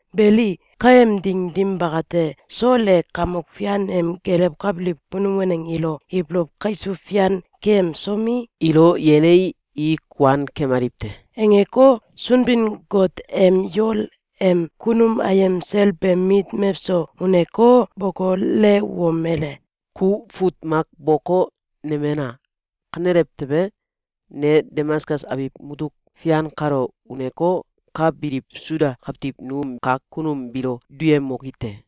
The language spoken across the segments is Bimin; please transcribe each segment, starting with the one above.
Beli, kaem ding dim bakate, Sol e Kamok Fian em gelewkabiliw kunum waneng ilo ibolow kaisuw fian keyemsomi, “Ilo yenii, i kuan kemaliw te!”, angeko, Sunbin-Got em yol em kunum ayem sel beem mit mewso uneko, bokolewomele: “Ku fut mak boko, nemena! Kanelew tewe, ne Damaskus abiw mutuk fian kalo uneko, ka biliw Suda kawtiw num kak kunum biilo duyemoki te.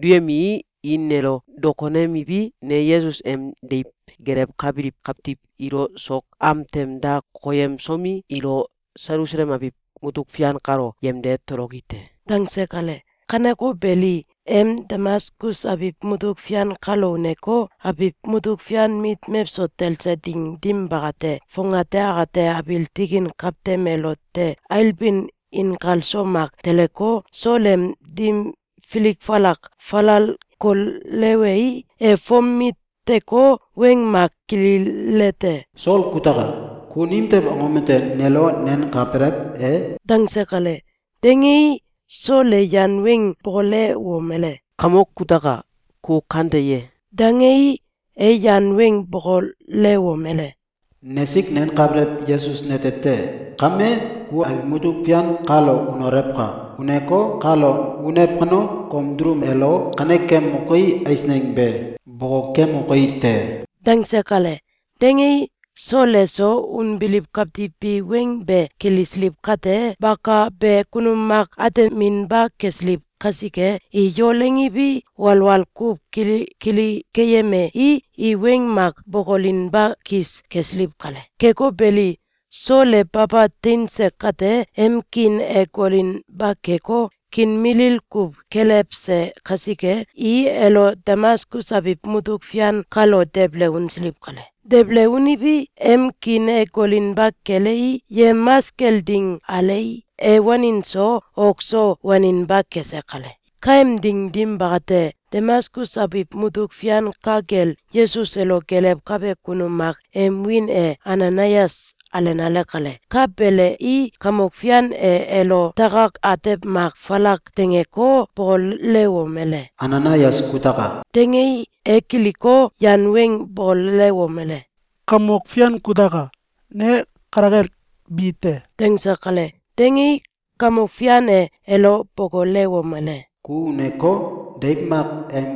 Duyemii, i nelo dokonemiwi, ne Yesus em deiw gelewkabiliw kawtiw ilo sok am tem da koyemsomi, ilo Selusalem abiw mutuk fian kalo yemde toloki te.”, dangse kale. Kaneko beli, em Damaskus abiw mutuk fian kalo uneko, abiw mutuk fian mit mewso talse ding dim bakate, fongate akate abiil tikin kawtem elote ailbin inkalso mak teleko, Sol em dim filik falak falal kolewei, e fom miteko, weng mak kililete: “Sol kutaka! Ku nimtew angom ete nelo nenkabelew e?”, dangse kale. Dangei, Sol e yan weng bokolewomele: “Kamok kutaka! Ku kante ye?”, dangei, e yan weng bokolewomele: “Nesik nenkabelew Yesus nete te! Kame, ku abiw mutuk fian kalo unolewka! Uneko, kalo unew kano, kom dulum elo kanekemoki eisneng be bokokemoki te!”, dangse kale. Dangei, Sol eso unbiliw kawtiw bi weng be kilisiliw kate, bakabe kunum mak ateminba kesiliw kasike, i yol angiwi, walwal kuw kilikili keyemei, i weng mak bokolinba kis kesiliw kale. Keko beli, Sol e baba teinse kate, em kiin e golinba keko, kiin milil kuw kelewse kasike, i elo Damaskus abiw mutuk fian kalo debele unsiliw kale. Debele uniwi, em kiin e golinba kelei, yemamas kel ding alei, e wanin so, ok so waninba kese kale. Kaem ding dim bakate, Damaskus abiw mutuk fian ka kel, Yesus elo gelewkabe kunum mak em wiin e Ananayas alenale kale. Ka belei, Kamok Fian e elo takak atew mak falak dangeko, bokolewomele: “Ananayas kutaka!”, dangei, e kiliko, yan weng bokolewomele: “Kamok Fian kutaka! Ne kale kel bi te!”, dangse kale. Dangei, Kamok Fian e elo bokolewomele: “Ku uneko, deiw mak em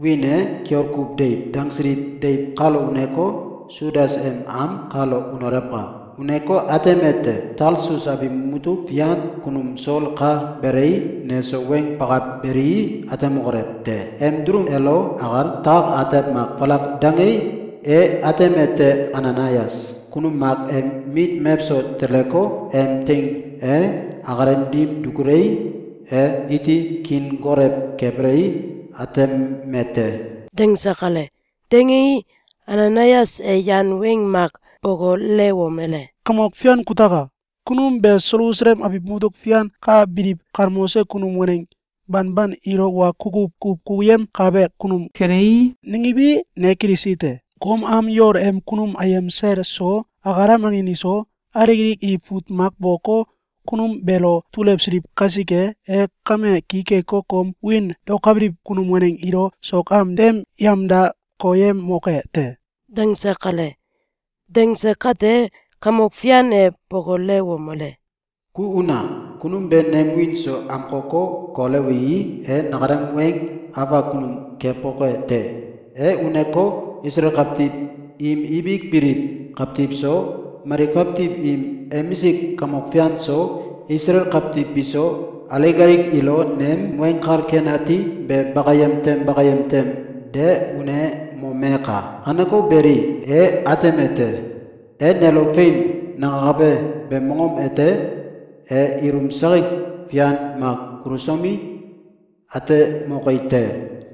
wiin e “Kiol Kuw Deiw”, dangsiliw deiw kalo uneko, Sudas em am kalo unolewka! Uneko, atemete: Talsus abiw mutuk fian kunum Sol ka belei, neso weng bakabelei, atemokolew te. Em dulum elo akal takak atew mak falak dangei, e atemete: Ananayas kunum mak em mit mewso teleko, em teing e akalem dim dukulei, e iti kiin golew kebelei, ateme te.”, dangse kale. Dangei, Ananayas e yan weng mak bokolewomele: “Kamok Fian kutaka! Kunum be Selusalem abiw mutuk fian ka biliw galmoselew kunum waneng banban ilo wa kukuw kuw kukuyemkabe kunum kelei, nangiwi, ne kilisi te. Kom am yol em kunum ayem sel so, akalem angin iso, alik alik i fut mak boko, kunum beelo dulewsiliw kasike, e kame ki keko, kom wiin daokabiliw kunum waneng ilo sok am tem yemda koyemoke te.”, dangse kale. Dangse kate, Kamok Fian e bokolewomele: “Ku una! Kunum be nem wiin so amkoko, kolewii, e nakalem weng afak kunum keboke te. E uneko, Isalael kawtiw im ibik biliw kawtiw so, mali kawtiw im emisik kamok fian iso, Isalael kawtiw biso, alik alik ilo nem Weng Kal Ken Ati be bakayem tem bakayem tem de unemomeka! Kaneko beli, e atemete: Em nelo ‘Fein!’, nangakabe beem mongom ete e ilum sakik fian mak kulusomi, atemoke te.”,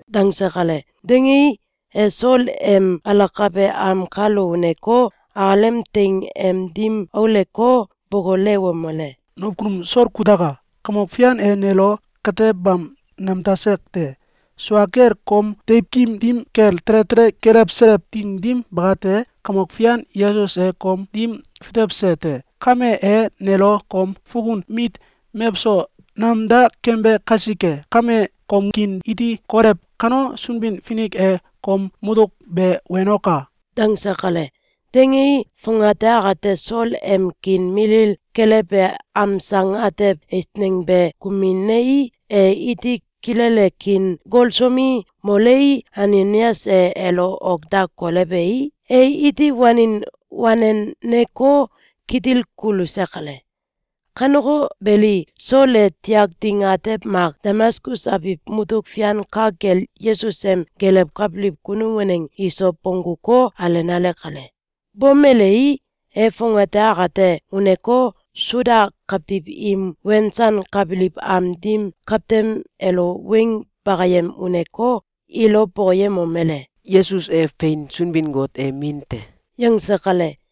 dangse kale. Dangei, e Sol em alakabe am kalo uneko, akalem teing em dim auleko, bokolewomele: “Nakunum Sol kutaka! Kamok Fian e nelo katebam nemdase te. Sua kel, kom deiwkim dim kel tele tele kelewselew ding dim bakate, Kamok Fian Yesus e kom dim fitewse te. Kame, e nelo kom fukun mit mewso namda kembe kasike kame, kom kiin iti golew kano, Sunbin-Finik e kom mutuk be wenoka!”, dangse kale. Dangei, fongate akate Sol em kiin milil kelewbe amsang atew eisneng be kuminei, e iti kilele kiin golsomi, molei, Ananayas e elo ok da kolewei, e iti wanin waneneko, kitil kuluse kale. Kaneko beli, Sol e tiak ding atew mak Damaskus abiw mutuk fian ka kel Yesus em gelewkabiliw kunum waneng iso bongguko, alenale kale. Bomelei, e fongate akate uneko, Suda kawtiw im wensankabiliw am dim kawtem elo weng bakayem uneko, ilo bokoyemomele: “Yesus e fein Sunbin-Got em Min te!”, yangse kale.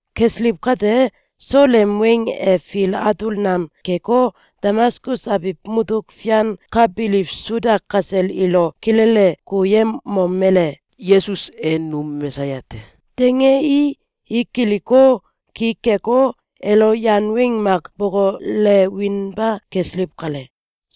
Kesiliw kate, Sol em weng e fil atul nam keko, Damaskus abiw mutuk fian ka biliw Suda kasel ilo kilele kukuyemomele: “Yesus e num Mesaya te!”, dangei, i kiliko, ki keko, elo yan weng mak bokolewinba kesiliw kale.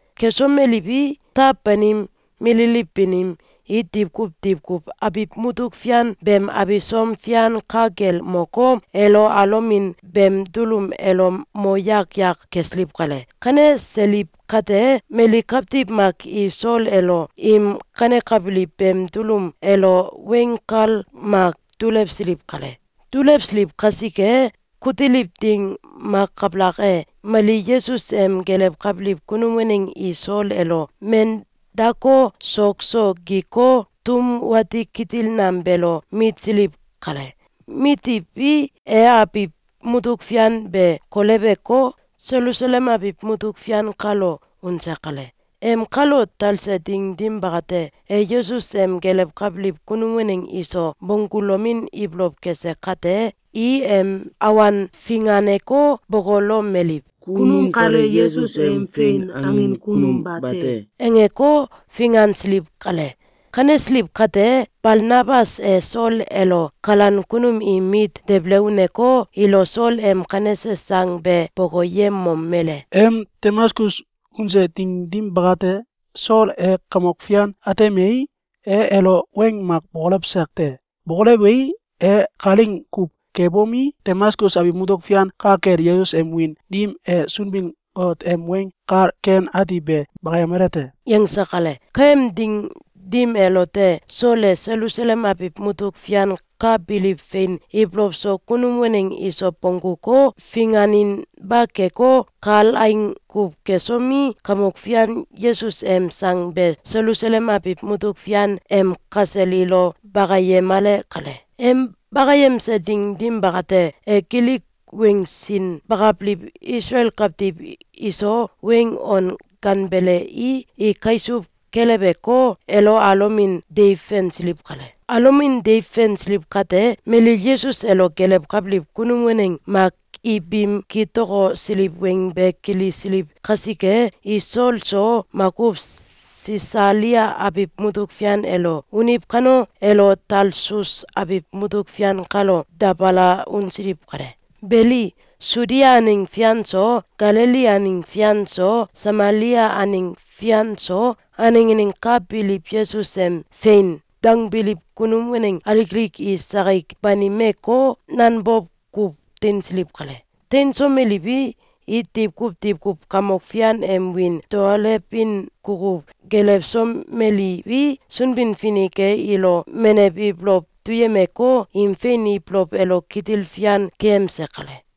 Kesomeliwi, taw banim, mililiw banim, i diwkuw diwkuw abiw mutuk fian beem abisom fian ka kel moko, elo alomin beem dulum elo mo yak yak kesiliw kale. Kaneseiliw kate, mali kawtiw mak i Sol elo im kanekabiliw beem dulum elo weng kal mak dulewsiliw kale. Dulewsiliw kasike, kutiliw ding mak kabalak e, mali Yesus em gelewkabiliw kunum waneng i Sol elo men dako, sok so giko, tum wati kitil nam beelo mitsiliw kale. Mitiwi, e abiw mutuk fian be koleweko, Selusalem abiw mutuk fian kalo unse kale. Em kalo talse ding dim bakate, e Yesus em gelewkabiliw kunum waneng iso bonggulomin ibolow kese kate, i em awan finganeko, bokolomeliw: “Kunum kale Yesus em fein angin kunum bate!”, angeko, fingansiliw kale. Kanesiliw kate, Balnabas e Sol elo kalan kunum im mit debele uneko, ilo Sol em kanese sang be bokoyemomele: “Em Damaskus unse ding dim bakate, Sol e Kamok Fian atemei, e elo weng mak bokolewse te. Bokolewei, e kalaing kuw kebomi, Damaskus abiw mutuk fian ka kel Yesus em wiin dim e Sunbin-Got em Weng Kal Ken Ati be bakayemale te.”, yangse kale. Kaem ding dim elote, Sol e Selusalem abiw mutuk fian ka biliw fein ibolow so kunum waneng iso bongguko, finganinba keko, kalaing kuw kesomi, Kamok Fian Yesus em sang be Selusalem abiw mutuk fian em kasel ilo bakayemale kale. Em bakayemse ding dim bakate, e Gilik weng sin bakabiliw Isalael kawtiw iso weng on ganbelei, i kaisuw keleweko, elo alomin deiw fensiliw kale. Alomin deiw fensiliw kate, mali Yesus elo gelewkabiliw kunum waneng mak i biim kitokosiliw weng be kilisiliw kasike, i Sol so makuw Sisalia abiw mutuk fian elo uniw kano, elo Talsus abiw mutuk fian kalo dabala unsiliw kale. Beli, Sudia aneng fian so, Galili aneng fian so, Samalia aneng fian so, aneng aneng ka biliw Yesus em “Fein!”, dangbiliw kunum waneng alik alik i sakik banimeko, nanbow kuw teinsiliw kale. Teinsomeliwi, i diwkuw diwkuw Kamok Fian em wiin daolewin kukuw gelewsomeliwi, Sunbin-Finik e ilo menew ibolow duyemeko, im fein ibolow elo kitil fian keyemse kale.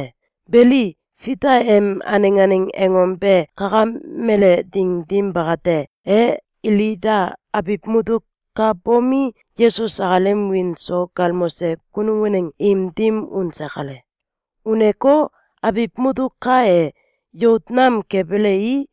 Beli, Fita em aneng aneng angom be kakamele ding dim bakate, e Ilida abiw mutuk ka bomi, Yesus akalem wiin so galmose kunum waneng im dim unse kale. Uneko, abiw mutuk ka e, yout nam kebelei,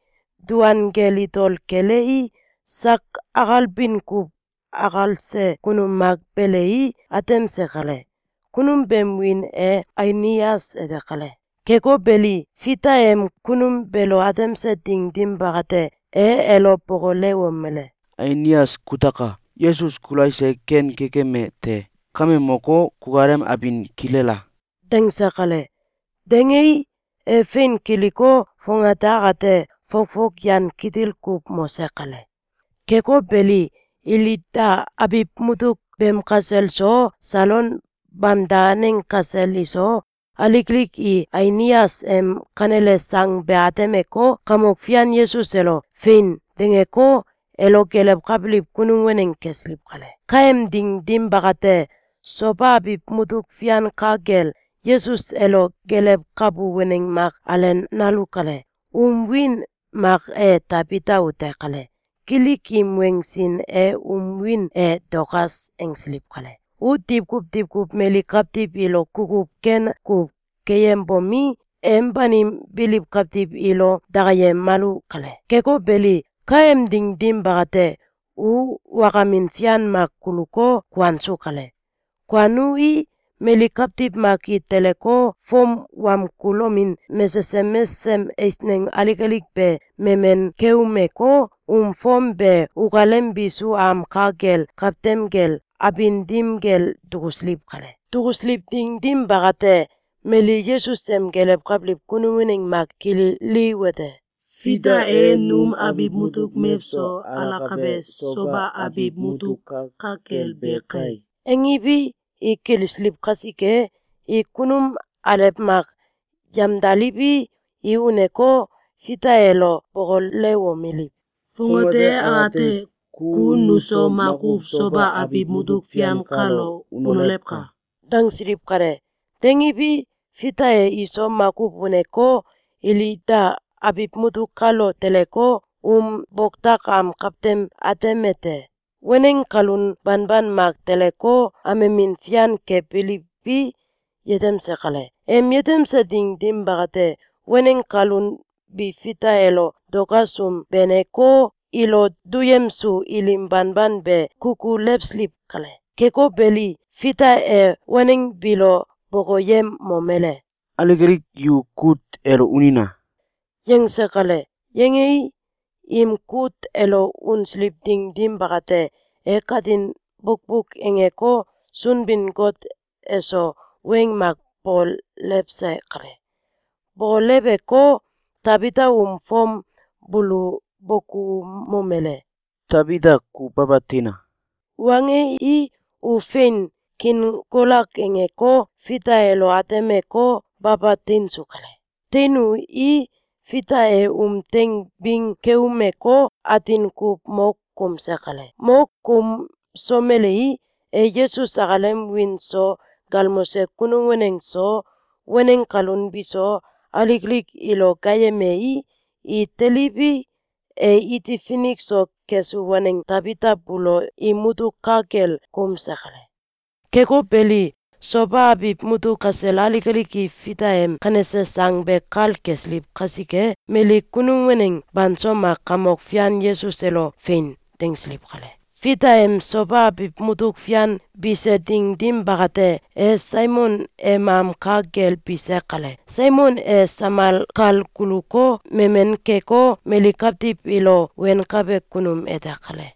duan kel itole kelei, sak akalbin kuw akalse kunum mak belei, atemse kale. Kunum beem wiin e Ainias ete kale. Keko belo, Fita em kunum beelo atemse ding dim bakate, e elo bokolewomele: “Ainias kutaka! Yesus Kulais e ken kekeme te! Kame moko, kukalem abin kilela!”, dangse kale. Dangei, e fein kiliko, fongate akate fokfok yan kitil kuw mose kale. Keko beli, Ilida abiw mutuk beem kasel so, Salon bamda aneng kasel iso, alik alik i Ainias em kanele sang be atemeko, Kamok Fian Yesus elo “Fein!”, dangeko, elo gelewkabiliw kunum waneng kesiliw kale. Kaem ding dim bakate, Soba abiw mutuk fian ka kel, Yesus elo gelewkabu waneng mak alenalu kale. Um wiin mak e Tabita ute kale. Gilik im weng sin e um wiin e Dokas angsiliw kale. U diwkuw diwkuw mali kawtiw ilo kukuw ken kuw keyembomi, em banim biliw kawtiw ilo dakayemalu kale. Keko beli, kaem ding dim bakate, u wakamin fian mak kuluko, kuansu kale. Kuanui, mali kawtiw mak i teleko, fom wamkulomin mesesem mesesem eisneng alik alik be memen keumeko, um fom be ukalem bisu am ka kel kawtem kel abin dim kel dukusiliw kale. Dukusiliw ding dim bakate, mali Yesus em gelewkabiliw kunum waneng mak kililiwete: “Fita e num abiw mutuk mewso alakabe Soba abiw mutuk ka kel be kai!”, angiwi, i kilisiliw kasike, i kunum alew mak yamdaliwi, i uneko, Fita elo bokolewomeliw: “Fongate akate ku nuso makuw Soba abiw mutuk fian kalo unolewka!”, dangsiliw kale. Dangiwi, Fita e iso makuw uneko, Ilida abiw mutuk kalo teleko, um boktak am kawtem atemete: Waneng kalun banban mak teleko, amemin fian kebiliwi, yetemse kale. Em yetemse ding dim bakate, waneng kalun bi Fita elo Dokas um beneko, ilo duyemsu ilim banban be kukulewsiliw kale. Keko beli, Fita e waneng biilo bokoyemomele: “Alik alik yu kut elo unina!”, yangse kale. Yangei, im kut elo unsiliw ding dim bakate, e katin bukbuk angeko, Sunbin-Got eso weng mak bokolewse kale. Bokoleweko, Tabita um fom buulo bokoumomele: “Tabita, ku baba teina!”, wangei, u fein, kiin golak angeko, Fita elo atemeko, baba teinsu kale. Teinui, Fita e um teing bing keumeko, atin kuw mo koumse kale. Mo koumsomelei, e Yesus akalem wiin so galmose kunum waneng so, waneng kalun biso, alik alik ilo gaayemei, i teliwi, e iti finik so kesu waneng Tabita buulo im mutuk ka kel koumse kale. Keko beli, Soba abiw mutuk kasel alik alik i Fita em kanese sang be kal kesiliw kasike, mali kunum waneng banso mak Kamok Fian Yesus elo “Fein!”, dangsiliw kale. Fita em Soba abiw mutuk fian bise ding dim bakate, e Saimon em am ka kel bise kale. Saimon e samal kal guluko, memen keko, mali kawtiw ilo wenkabe kunum ete kale.